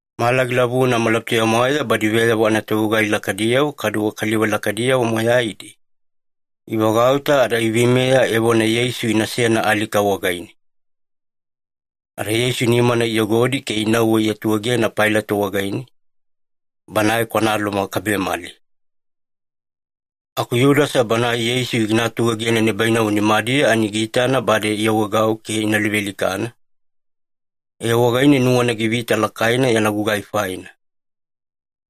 Mala gilavuna malabutuya-mwaeya badi veyavo anatovegugai lakaidiyavo kaduwe kaliva lakaidiyavo moyaidi, ivagauta ada iveimeya evona Yeisu inasena alika wagaine. Ada Yeisu nimana iyogodi ke inauwe iatuegena Pailato wagaine, banae kwana Loma kabemali. Aku Yudasa banae Yeisu gina atuegena nibainavo nimadiya ani giitana bade iawaegau ke ina luvealikana, ee wagaine nuwana givita lakaina yana gugai faina.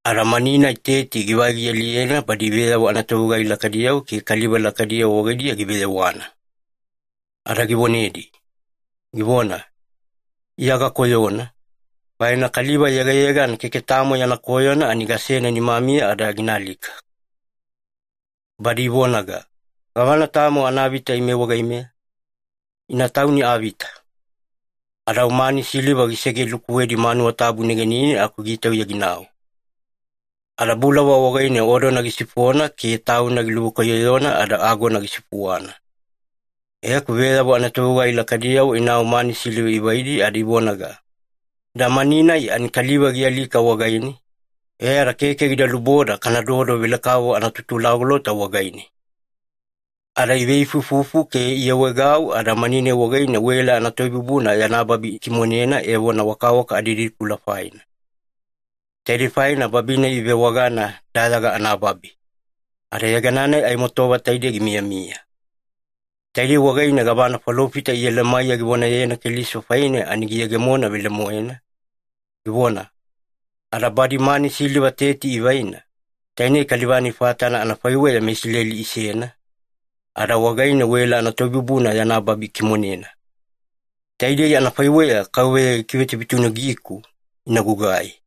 Ada mani-nai teti givai gialiyena badi veyavo anatovegugai lakaidiyavo ke kaliva lakaidiyavo wagaidiya giveyewana. Ada givonedi, givona, “Iya gakoyona, faina kaliva yegayegana keke tamo yana koyona ani gasena nimamiya ada gina alika.” Badi ivonaga, “Gavana tamo anavita ime wagaimeya? Ina tauni avita!” Ada au mani siliva gisegelukuwedi manuwa tabu negenine aku gitauya ginau. Ada bulava wagaine odona gisifona ke tauna giluvekwaiyoyona ada agona gisifuwana. E aku veyavo anatovegugai lakaidiyavo inau mani siliva ivaidi ada ivonaga, “Ida mani-nai ani kaliva gialika wagaine, e ada keke gida luboda kanadodo velekavovo anatutulagolota wagaine.” Ada iveifuifufu ke iawaegau ada mani-nai wagaine wela anatoibubuna yana babi ikimonena evona wakawaka adididikula faina. Taidei faina babi-nai ivewagana ‘Dayaga anaBabi’, ada yegana-nai aimo tova taidei gimiyamiya. Taidei wagaine gavana falofita Iyelemaiya givonayena Keliso faine ani giyegemona velemoena, givona, “Ada badi mani siliva teti ivaina, tainei kaliva-nai fatana anafaiweya meIsileli isena, ada wagaine wela anatoibubuna yana babi ikimonena. Taidei anafaiweya KAUVEYA gikivetunutunugiku ina gugai.”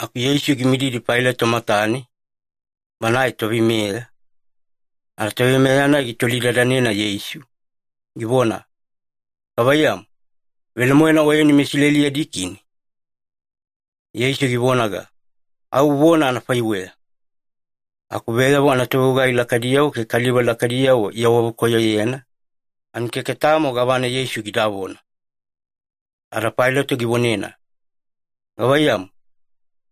Aku Yeisu gimididi Pailato matane, banae toveimeya, ada toveimeya-nai gitolidadanena Yeisu, givona, “Gavaiyamu, velemoena Oyeni meIsileli yadi kini?” Yeisu givonaga, “Au uvona anafaiweya.” Aku veyavo anatovegugai lakaidiyavo ke kaliva lakaidiyavo iawavekoyoyena, ani keke tamo gavana Yeisu gidavona. Ada Pailato givonena, “Gavaiyamu,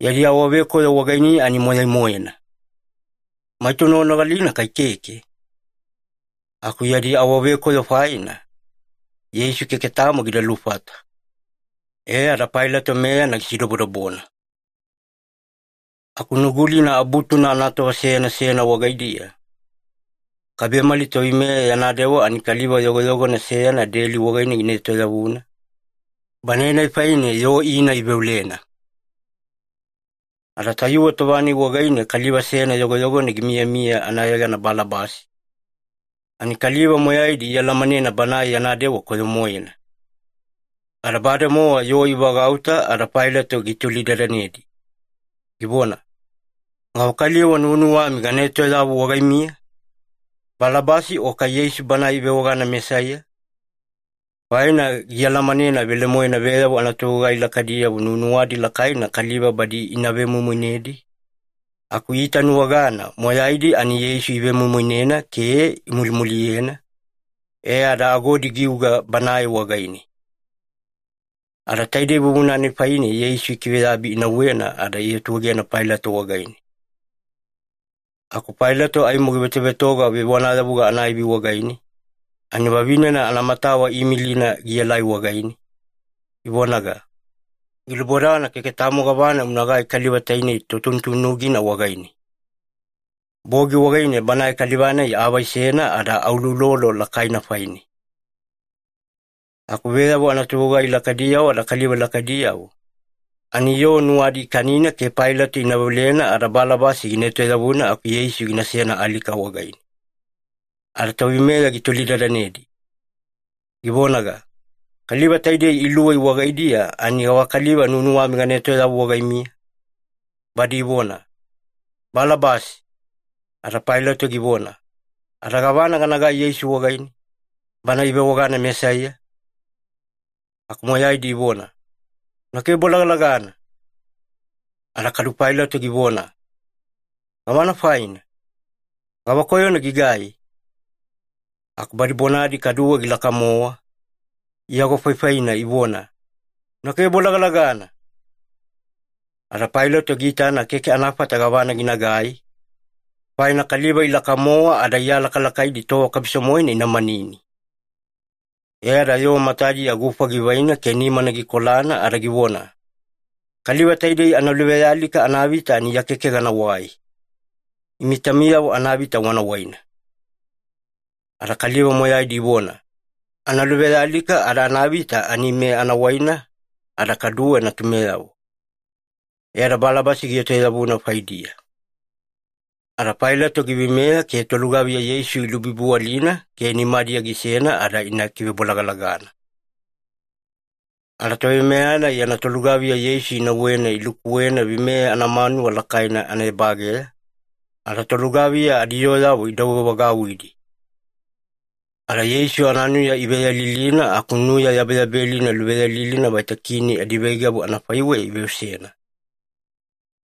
yadi awavekoyo wagainiya ani moyai-moena. Maita unoganogalina kai keke?” Aku yadi awavekoyo faina, Yeisu keke tamo gida lufata. E ada Pailato meyana gisidobodobona. Aku Nugulina Abutuna anatova seyana seyana wagaidiya, kabemali toveimeya yana dewa ani kaliva yogoyogona seyana deli wagaine gina etoyavuna, banae-nai faine yoo ina veolena. Ada tayuwe tova-nai wagaine kaliva seyana yogoyogona gimiyamiya anayegana Balabasi, ani kaliva moyaidi ialamanena banae yana dewa koyo-moena. Ada bademowa yoo ivagauta ada Pailato gitolidadanedi, givona, “Gavakaliva nuwanuwami gana etoyavu wagaimiya, Balabasi o kai Yeisu Banae ivewagana Mesaiya?” Faina gialamanena velemoena veyavo anatovegugai lakaidiyavo nuwanuwadi lakaina kaliva badi ina vemoimoinedi, aku iitanuwagana moyaidi ani Yeisu ivemoimoinena ke imulimuliyena, e ada agodi giuga Banae wagaine. Ada taide vuvuna-nai faine Yeisu ikiveyabi inauwena ada iatuegena Pailato wagaine. Aku Pailato aimo givetovetoga vevonayavuga anaivi wagaine, ani vavinena anamatawa iimilina gielai wagaine, ivonaga, “Gilubodana keke tamo gavana unagai kaliva tainei totunutunugina wagaine. Bogi wagaine banae kaliva-nai aavaisena ada auloulolo lakaina faine.” Aku veyavo anatovegugai lakaidiyavo ada kaliva lakaidiyavo, ani yoo nuwadi ikanina ke Pailato ina veolena ada Balabasi gina etoyavuna aku Yeisu ginasena alika wagaine. Ada toveimeya gitolidadanedi, givonaga, “Kaliva taidei iluwei wagaidiya ani gavakaliva nuwanuwami gana etoyavu wagaimiya?” Badi ivona, “Balabasi!” Ada Pailato givona, “Ada gavana ganagai Yeisu wagaine, banae ivewagana Mesaiya?” Aku moyaidi ivona, “Una kivebolagalagana!” Ada kadu Pailato givona, “Gavana faina? Gavakoyona gigai?” Aku badi bonadi kaduwe gilaka-mowa, iagofaifaina ivona, “Una kivebolagalagana!” Ada Pailato giitana keke anafata gavana ginagai, faina kaliva ilaka-mowa ada ialakalakaidi tova kabiso-moena ina manini. E ada yoo matadiya gufa givaina ke nimana gikolana ada givona, “Kaliva taidei analuvealika anavita ani Iya keke ganawai. Imi taumiyavo anavita wana waina.” Ada kaliva moyaidi ivona, “Analuvealika ada anavita ani ime ana waina ada kaduwe natumeyavo.” E ada Balabasi gietoyavuna faidiya. Ada Pailato giveimeya ke tolugaviya Yeisu ilubibiwalina ke nimadiya gisena ada ina kivebolagalagana. Ada toveimeya-nai yana tolugaviya Yeisu inauwena ilukuwena veimeya anamanuwa lakaina anaebageya, ada tolugaviya adiyooyavo idouwevagauwidi. Ada Yeisu ananuya iveyalilina aku nuya yabeyabelina luveyalilina vaita kini adiveigavu anafaiweya iveosena.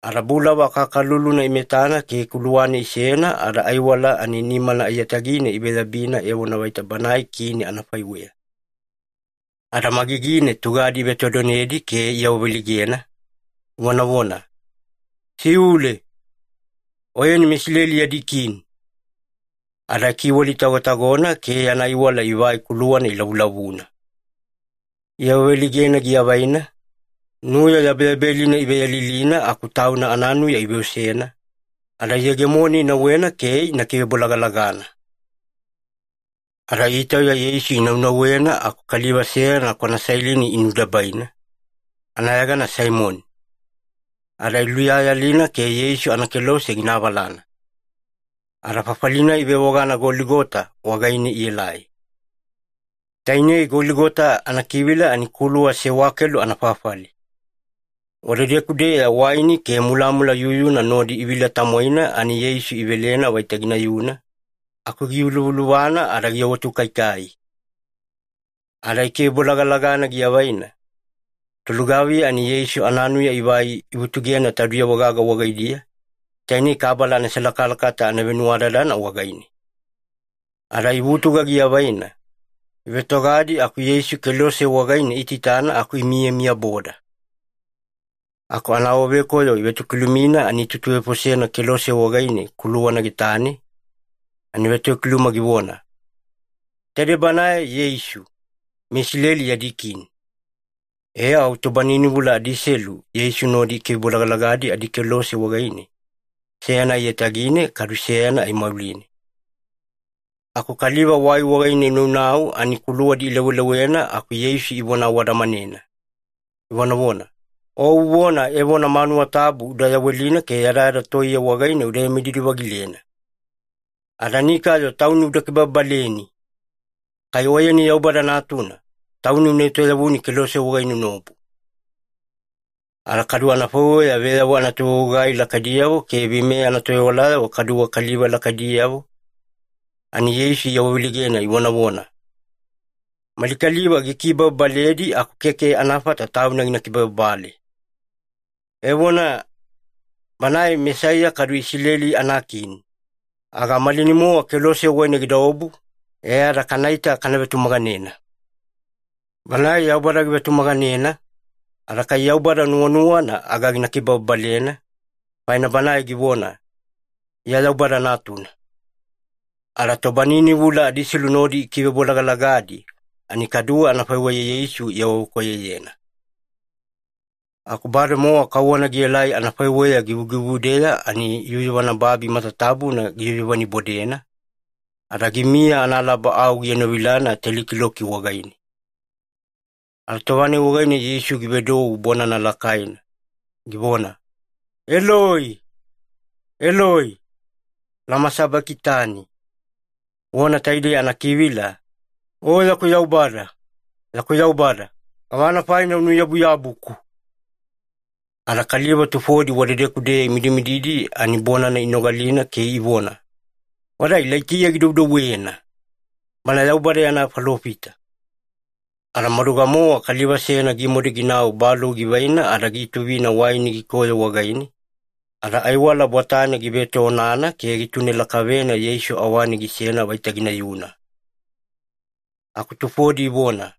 Ada bulava akakaluluna imetana ke kuluwane isena ada aiwala ani nimana aiyatagine iveyabina evona vaita Banae kini anafaiweya. Ada magigine tugadi ivetodonedi ke iawaveleigena, ivonavona, “Siule! Oyeni meIsileli yadi kini!” Ada ikiwalitagotagona ke yana aiwala ivai kuluwana ilavulavuna. Iawaveleigena giavaina, nuya yabeyabelina iveyalilina aku Tauna ananuya iveosena, ada iyegemone inauwena ke ina kivebolagalagana. Ada itauya Yeisu inaunauwena aku kaliva seyana kwana Sailini inudebaina, anayegana Saimoni. Ada iluyayalina ke Yeisu anakelose gina avalana. Ada fafali-nai ivewagana Goligota wagaine ielai. Tainei ‘Goligota’ anakivila ani ‘Kuluwa Sewakelu anaFafali’. Wadedeku-deya waini ke mulamula yuyuna nodi ivila-tamwaina ani Yeisu ivelena vaita ginayuna, aku giyuluvaluvana ada giawatukaikai. Ada ikivebolagalagana giavaina, tolugaviya ani Yeisu ananuya ivai ivutugena taudiyavo gaga wagaidiya, taine kabala anaselakalakata anavenuwadadana wagaine. Ada ivutuga giavaina, ivetogadi aku Yeisu kelose wagaine iitaitana aku imiyamiyaboda. Aku anaawavekoyo ivetokilumina ani itutuvefosena kelose wagaine kuluwana getane, ani vetokiluma givona, “TAIDEI BANAE YEISU, MeISILELI YADI KINI.” E au tobaninivula adiselu Yeisu nodi ikivebolagalagadi adikelose wagaine, seyana aiyatagine kadu seyana aimauline. Aku kaliva wai wagaine inaunau ani kuluwadi ilewalewana aku Yeisu ivona awadamanena, ivonavona, “O uvona evona manuwa tabu uda yawelina ke yadayada toiye wagaine uda vemididi-vagilena! Ada nikayo Tauni uda kibababaleni! Kai Oyeni Yaubada Natuna, Tauni una etoyavuni kelose wagaine unaobu!” Ada kadu anafaiweya veyavo anatovegugai lakaidiyavo ke veimeya anatovewalayavo kaduwe kaliva lakaidiyavo, ani Yeisu iawaveleigena ivonavona, “Mali kaliva gikibababaledi aku keke anafata Tauna gina kibababale. Evona, Banae Mesaiya kadu Isileli anakini, aga malinai-mowa kelose wagaine gidaobu, e ada kanaita kana vetumaganena. Banae Yaubada givetumaganena, ada kai Yaubada nuwanuwana aga gina kibababalena, faina Banae givona, ‘Iya Yaubada Natuna.’” Ada tobaninivula adiselu nodi ikivebolagalagadi ani kaduwe anafaiweya Yeisu iawavekoyoyena. Aku bademowa kauwana gielai anafaiweya givugivudeya ani yuyuvana babi matatabuna giyuyuvanibodena, ada gimiya analaba au gienovilana teli kiloki wagaine. Ada tova-nai wagaine Yeisu givedou bonana lakaina, givona, “Eloi, Eloi, lama sabakitani?” Vona taidei anakivila “O yaku Yaubada, yaku Yaubada, gavana faina unuyabuyabuku?” Ada kaliva tufodi wadedeku-deya imidimididi ani bonana inogalina ke ivona, “Wada Ilaitiya gidoudouwena, bana Yaubada yana falofita.” Ada maduga-mowa kaliva seyana gimadu ginau balou givaina ada giutuvina waini gikoyo wagaine, ada aiwala bwatane give etoonana ke gitune lakavena Yeisu awane gisena vaita ginayuna. Aku tufodi ivona,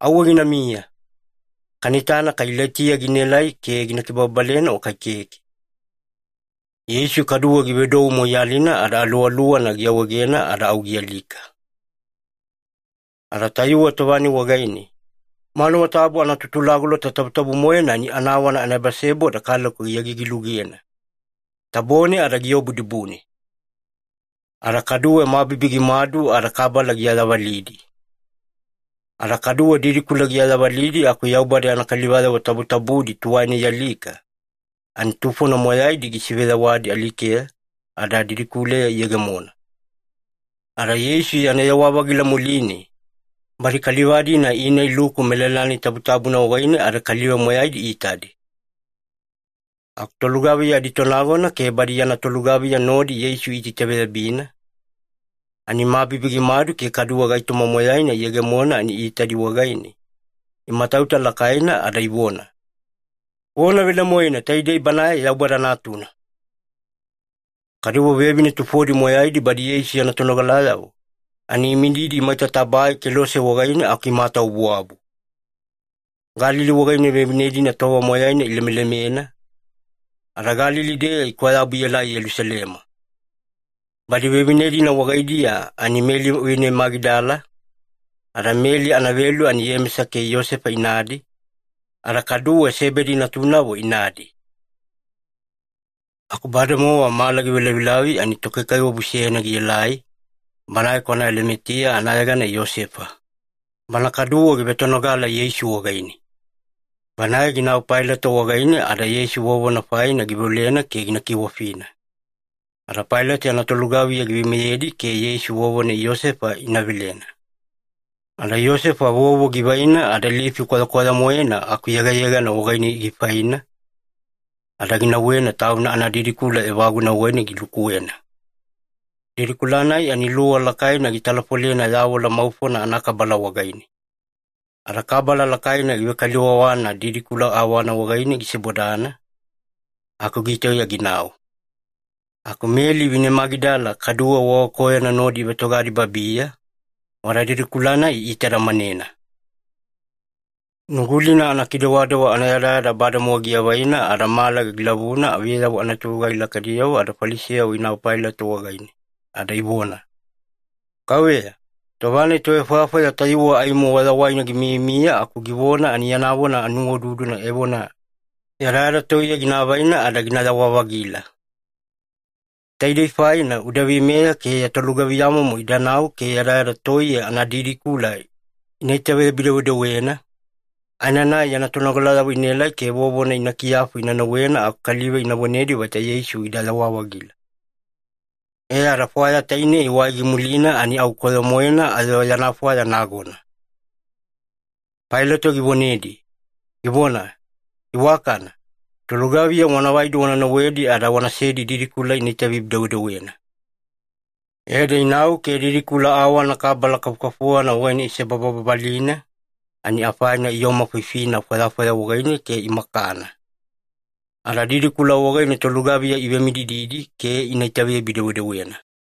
“Auwe ginamiya. Kana itana kai Ilaitiya ginaelai ke gina kibababalena o kai keke.” Yeisu kaduwe givedou moiyalina ada aluwaluwana giawaegena ada au gialika. Ada tayuwe tova-nai wagaine, manuwa tabu anaTutulagolota Tabutabu-moena ani anawana anaebaseboda kaleko giagigi-lugena, tabone ada giobu dibune. Ada kaduwe mabibi gimadu ada kabala giayavalidi. Ada kaduwe didikula giayavudi aku Yaubada yana kalivayavo tabutabudi tuwaina ialika, ani tufona moyaidi gisiveyawadi alikeya ada didikuleya iyegemona. Ada Yeisu yana yawa-vagila muline, badi kaliva-dina ina iluku melala-nai tabutabuna wagaine ada kaliva moyaidi iitadi. Aku tolugaviya aditonagona ke badi yana tolugaviya nodi Yeisu iitaitaveyabina, ani mabibi gimadu ke kaduwe gaitoma moyaina iyegemona ani iitadi wagaine, imatauta lakaina ada ivona, “Vona velemoena taidei Banae Yaubada Natuna!” Kaduwe vevine tufona moyaidi badi Yeisu yana tonogalayavo, ani imididi maita tabae kelose wagaine aku imatawabuwabu. Galili wagaine vevine-dina tova moyaina ilemelemena, ada Galili-deya ikwayabu ielai Yelusalema. Badi vevine-dina wagaidiya ani Meli vine Magidala, ada Meli anavelu ani Iyemesa ke Iyosefa inadi, ada kaduwe Sebedi natunavo inadi. Aku bademowa mala givelavilavi ani tokaikaiwabu seyana gielai, banae kwana Alimatiya anayegana Iyosefa. Bana kaduwe givetonogala Yeisu wagaine. Banae ginau Pailato wagaine ada Yeisu vovona faina giveolena ke gina kiwafina. Ada Pailato yana tolugaviya giveimeyedi ke Yeisu vovona Iyosefa ina velena. Ada Iyosefa vovo givaina ada lifi kwayakwaya-moena aku yegayegana wagaine gifaina, ada ginauwena tauna anadidikula evaguna wagaine gilukuwena. Didikula-nai ani luwa lakaina gitalafolena yavola maufona anakabala wagaine. Ada kabala lakaina givekaliwawana didikula awana wagaine gisebodana, aku gitauya ginau. Aku Meli vine Magidala kaduwe wagakoyona nodi ivetogadi babiya, wada didikula-nai iitadamanena. Nugulina anakidewadewa anayadayada bademowa giavaina ada mala gilavuna veyavo anatovegugai lakaidiyavo ada Falisiyavo inau Pailato wagaine ada ivona, “Kauveya, tova-nai tovefwayafwaya tayuwe aimo wayawaina gimiyamiya aku givona ani yana vona anuwaududuna evona, yadayada toiye gina avaina ada ginayawa-vagila. Taidei faina uda veimeya ke ya tolugaviyamomo idanau ke yadayada toiye anadidikula ina itaveyabi-dewedewena, aenanai yana tonogalayavo inaelai ke vovona ina kiyafu ina nauwena aku kaliva ina vonedi vaita Yeisu gidayawa-vagila. E ada fwaya tainei wai gimulina ani au koyo-moena ayo yana fwaya nagona.” Pailato givonedi, givona, “Iwakana. Tolugaviya wana vaidi wana nauwedi ada wanasedi didikula ina itaveyabi-dewedewena.” E ada inau ke didikula awana kabala kafukafuwana wagaine isebababalina, ani afaina iomafifina fwayafwaya wagaine ke imakana. Ada didikula wagaine tolugaviya ivemidididi ke ina itaveyabi-dewedewena.